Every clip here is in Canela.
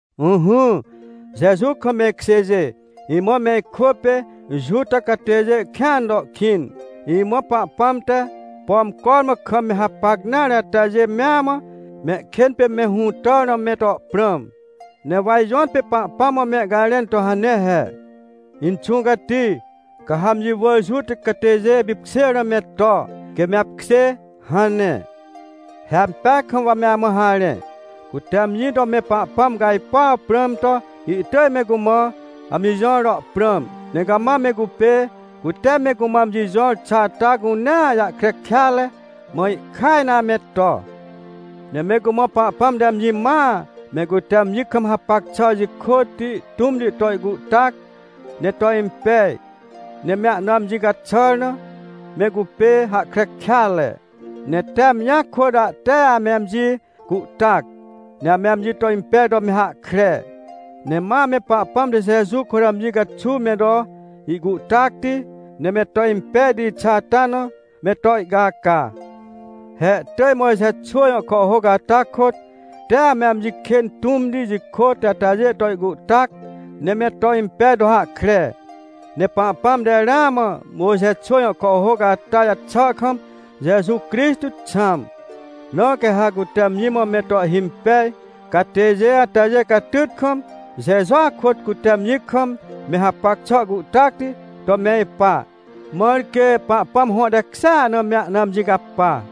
Ỹhỹ, Jeju kam me ikjêjê. Imã me ikwỳ pê Juta catêjê kĩan to kĩn. Imã Pahpãm te, pom cormã kam me hapac nare atajê mea mã, mehkên pê me hũtàr na me to prãm. Ne wa ijõtpê Pahpãm mã mehcajrẽn to hane he: — Inxũ Cati, ca ha amji wỳr Juta catêjê pipkjêr na me to, quê me apkjê — hane. He ampeaj kam wa me amã harẽ. Cute amji to me Pahpãm cajpuaw prãm to, ihtỳj me cumã amji jõr to prãm, ne cama me cupê, cute me cumã amji jõr xà ata cunea jahkre kêatre, mã ihkaj na ame to. Ne me cumã Pahpãm te amji mãa, me cute amji kam hapac xà jikôtti tũmti to ihcuhtac, ne to impej, ne me ahna amji caxàr na, me cupê hahkre kêatre. Ne tee amjia kôt ahte ame amji cuhtac, ne ame amji to impej to me hahkre. Ne ma ame Pahpãm te Jeju kôt amji caxuw me to ihcuhtacti, ne me to impejti xà ata na me to ihcaca. He ihtỳj Mojxe xwỳ jõ kàhhôc ata kôt, tee ame amji kên tũmti, jikôtti atajê to ihcuhtac, ne me to impej to hahkre. Ne Pahpãm te ramã Mojxe xwỳ jõ kàhhôc ata jaxà kam Jeju Crixtô xãm. Na quê ha cute amji mã me to ihhimpej catêjê atajê catyt kam, Jejua kôt cute amji kam me hapac xà cuhtacti to me ipa, mãr quê Pahpãm hõ tekjêa na me ahna amji capa.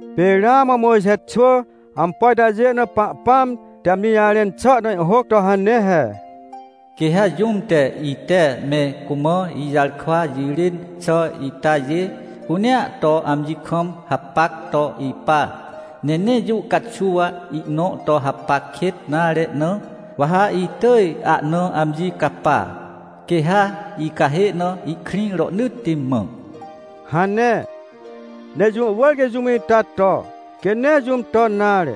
Pê ramã Mojxe xwỳ ampo itajê na Pahpãm te amji jarẽn xà na ihhôc to hane he: “Quê ha jũm te, ite me cumã ijarkwa jirên xà itajê cunea to amji kam hapac to ipa, ne nee jũ caxuw ihnõ to hapac kêt nare na, wa ha itỳj ahna amji capa, quê ha icahê na ihkrĩ rohnỳtti mã” hane. Ne jũ wỳr quê jũm ita to, quê nee jũm ton nare.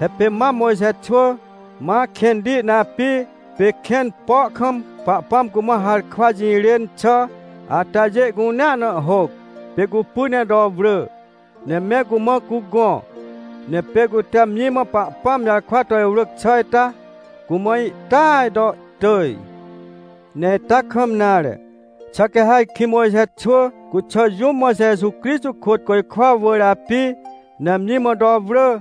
He pê mam Mojxe xwỳ, ma kẽnti na api, pê kẽn po kam Pahpãm cumã harkwa jirên xà atajê cunea na ihhôc, pê cupy ne to wrỳ, ne me cumã cugõ. Ne pê cute amji mã Pahpãm jarkwa to iwrỳc xà ita, cumã ihtỳaj to ihtỳj. Ne ita kam nare. Xà quê ha ajkĩ Mojxe xwỳ cuxà, jũm ma Jeju Crixtô kôt côjkwa wỳr api, ne amji mã to wrỳ,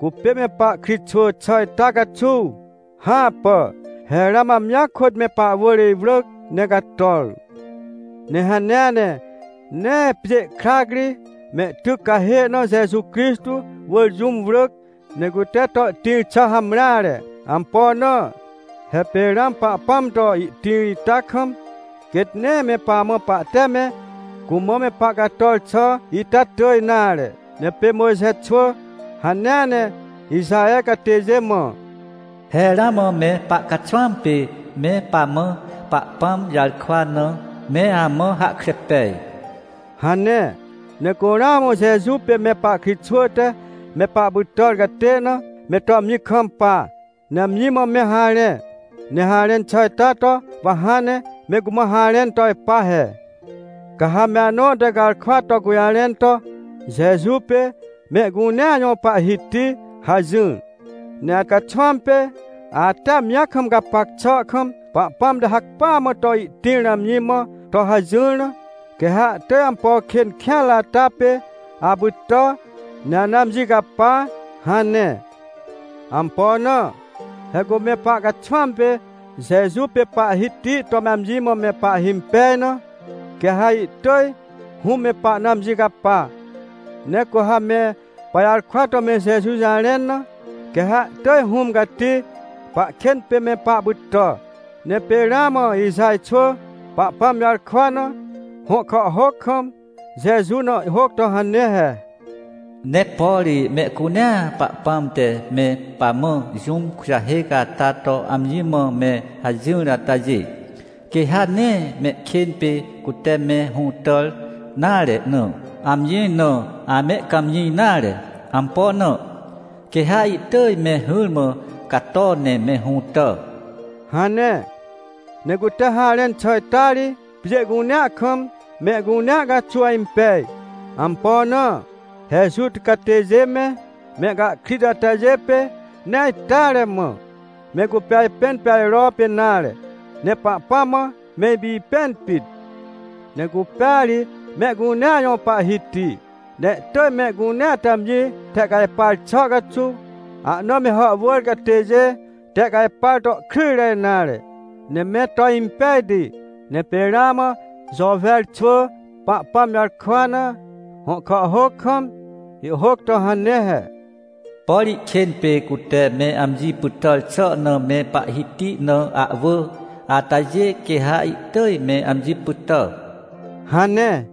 cupê me pahkritxwỳ xà ita caxuw? Hãpà! He ramã amjia kôt me pahwỳr iwrỳc, ne cator. Ne hanea ne, nee pjê krac ri mehtyc cahê na Jeju Crixtô wỳr jũm wrỳc, ne cute to ihtĩr xà hamreare. Ampo na? He pê ramã Pahpãm to ihtĩr ita kam, quêt nee me pamã pahte me cumã me pahcator xà ita tỳj nare. Ne pê Mojxe xwỳ hanea ne Ixaher catêjê mã: “He ramã me pahcaxwãm pê me pamã Pahpãm jarkwa na, me amã hahkre pej” hane. Ne cu ramã Jeju pê me pahkritxwỳ te me pahpytàr catê na, me to amji kampa, ne amji mã me harẽ. Ne harẽn xà ita to wa hãn ne me cumã harẽn to ipa he: — Ca ha me anõ te garkwa to gũjarẽn to: “Jeju pê mehcunea jõ Pahhiti” hajỹr, ne acaxwãm pê, ate amji kam gapac xà kam, Pahpãm te hacpỹa mã to ihtĩr na amji mã to hajỹr na, quê ha ihtỳj ampo kên kêanre ata pê apytà, ne ana amji capa — hane. Ampo na? He cu me pahcaxwãm pê Jeju pê Pahhiti to amji mã me pahhimpej na, quê ha ihtỳj Hũm me pahna amji capa. Ne cu ha me pajarkwa to me Jeju jarẽn na, quê ha ihtỳj Hũm Cati pahkên pê me pahpytà. Ne pê ramã Ixaj xwỳ Pahpãm jarkwa na, hõ kàhhôc kam, Jeju na ihhôc to hane he: “Ne por mehcunea Pahpãm te me pamã jũm kujahêc ata to amji mã me hajỹr atajê, quê ha nee mehkên pê cute me hũtàr nare na, amji na amehcãmjĩ nare. Ampo na? Quê ha ihtỳj me hỹrmã cato ne me hũtà” hane. Ne cute harẽn xà ita ri, pjê cunea kam, mehcunea caxuw impej. Ampo na? He Juta catêjê me, mehcahkrit atajê pê nee ajteare mã, me cupê ajpẽn pê ajropê nare. Ne Pahpãm mã me ipipẽn pit. Ne cupêa ri mehcunea jõ Pahhiti, ne ihtỳj mehcunea te amji tehcajpar xà caxuw, ahna me hàhwỳr catêjê tehcajpar to kryjre nare, ne me to impejti. Ne pê ramã Jôwer xwỳ Pahpãm jarkwa na, hõ kàhhôc kam, ihhôc to hane he: “Por ihkên pê cute me amji pytàr xà na me Pahhiti na ahwỳ atajê, quê ha ihtỳj me amji pytà” hane.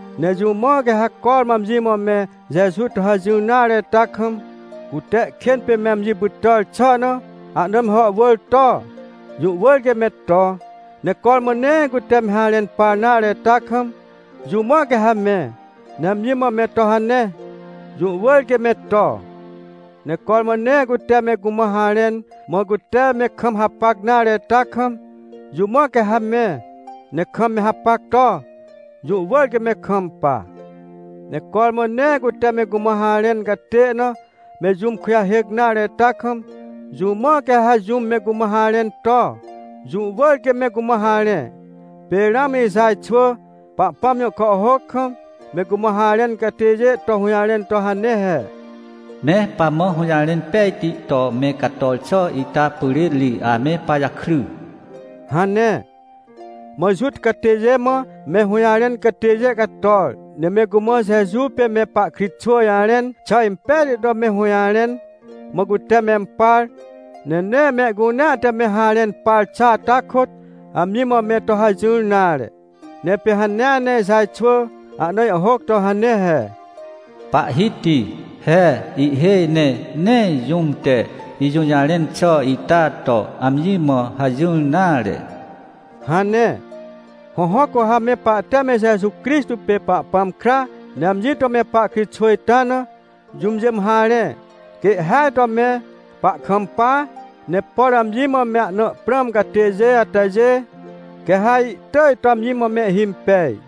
Ne jũ mã quê ha cormã amji mã me Jeju to hajỹr nare ita kam, cute ihkên pê me amji pytàr xà na ahna me hàhwỳr to? Jũ wỳr quê me to. Ne cormã nee cute me harẽn par nare ita kam, jũ mã quê ha me, ne amji mã me to hane? Jũ wỳr quê me to. Ne cormã nee cute me cumã harẽn, mã cute me kam hapac nare ita kam, jũ mã quê ha me, ne kam me hapac to? Jũ wỳr quê me kampa. Ne cormã nee cute me cumã harẽn catê na, me jũm kujahêc nare ita kam, jũ mã quê ha jũm me cumã harẽn to? Jũ wỳr quê me cumã harẽ. Pê ramã Ixaj xwỳ Pahpãm jõ kàhhôc kam, me cumã harẽn catêjê to hũjarẽn to hane he: “Me pamã hũjarẽn pejti to me cator xà ita pyrên ri ame pajakry” hane. Mã Juta catêjê mã me hũjarẽn catêjê cator, ne me cumã Jeju pê me pahkritxwỳ jarẽn xà impejti to me hũjarẽn, mã cute mempar. Ne nee mehcunea te me harẽn par xà ata kôt, amji mã me to hajỹr nare. Ne pê hanea ne Ixaj xwỳ ahna ihhôc to hane he: “Pahhiti! He ihhêj ne nee jũm te ijũjarẽn xà ita to amji mã hajỹr nare” hane. Hõhõ, cu ha me pahte me Jeju Crixtô pê Pahpãm kra, ne amji to me pahkritxwỳ ita na, jũmjê mã harẽ, quê ihhêaj to me pahkampa, ne por amji mã me ahna prãm catêjê atajê, quê ha ihtỳj to amji mã mehhimpej.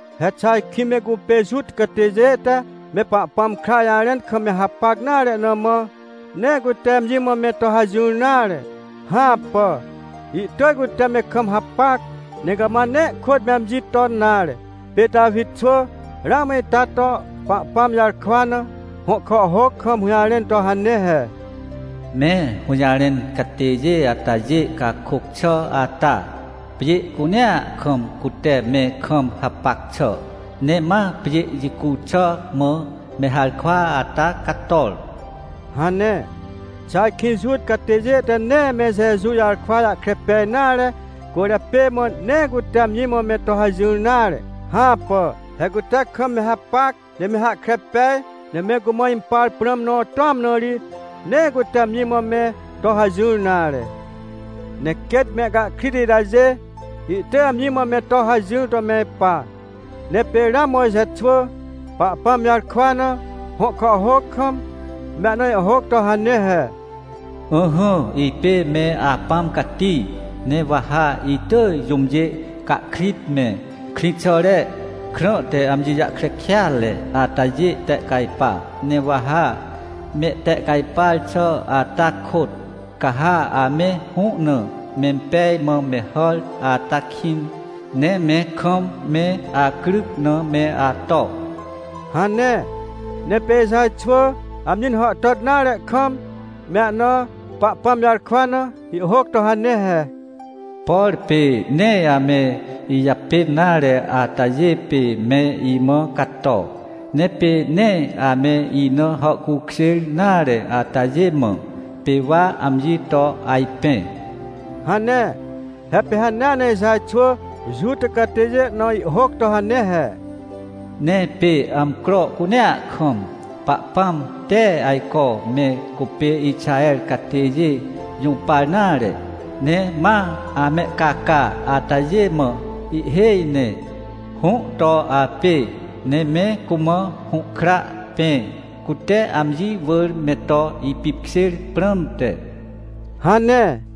He xà ajkĩ me cupê Juta catêjê te me Pahpãm kra jarẽn kam me hapac nare na mã, nee cute amji mã me to hajỹr nare? Hãpà! Ihtỳj cute me kam hapac, ne cama nee kôt me amji ton nare. Pê Tawi xwỳ ramã ita to, Pahpãm jarkwa na, hõ kàhhôc kam hũjarẽn to hane he: “Me hũjarẽn catêjê atajê cakôc xà ata, pjê cunea kam cute me kam hapac xà. Ne ma pjê jicu xà mã me harkwa ata cator” hane. Xà ajkĩ Juta catêjê te nee me Jeju jarkwa jahkre pej nare cwỳrjapê mã, nee cute amji mã me to hajỹr nare? Hãpà. He cute kam me hapac, ne me hahkre pej, ne me cumã impar prãm nõ tũam na ri, nee cute amji mã me to hajỹr nare. Ne quêt mehcahkrit itajê, ihtỳj amji mã me to hajỹr to me ipa. Ne pê ramã Mojxe xwỳ, Pahpãm jarkwa na, hõ kàhhôc kam, me ahna ihhôc to hane he: “Ỹhỹ, ipê me Apãm Cati, ne wa ha itỳj jũmjê cahkrit me, krĩxàre krã te amji jahkre kêatre atajê tehcajpa. Ne wa ha mehtehcajpar xà ata kôt, ca ha ame hũ na mempej mã me hàr ata kĩn, ne me kam me acryc na me ato” hane. Ne pê Ixaj xwỳ amji na hàhtàt nare kam me ahna, Pahpãm jarkwa na, ihhôc to hane he: “Por pê nee ame ijapên nare atajê pê me imã cato. Ne pê nee ame ina hàhcukjêr nare atajê mã, pê wa amji to ajpẽ” hane. He pê hanea ne Ixaj xwỳ Juta catêjê na ihhôc to hane he: “Ne pê amcro cunea kam, Pahpãm tee ajco me cupê Ixaher catêjê jũpar nare, ne ma amehcaca atajê mã ihhêj ne, hũ to apê, ne me cumã hũhkra pẽ, cute amji wỳr me to ipipkjêr prãmte” hane.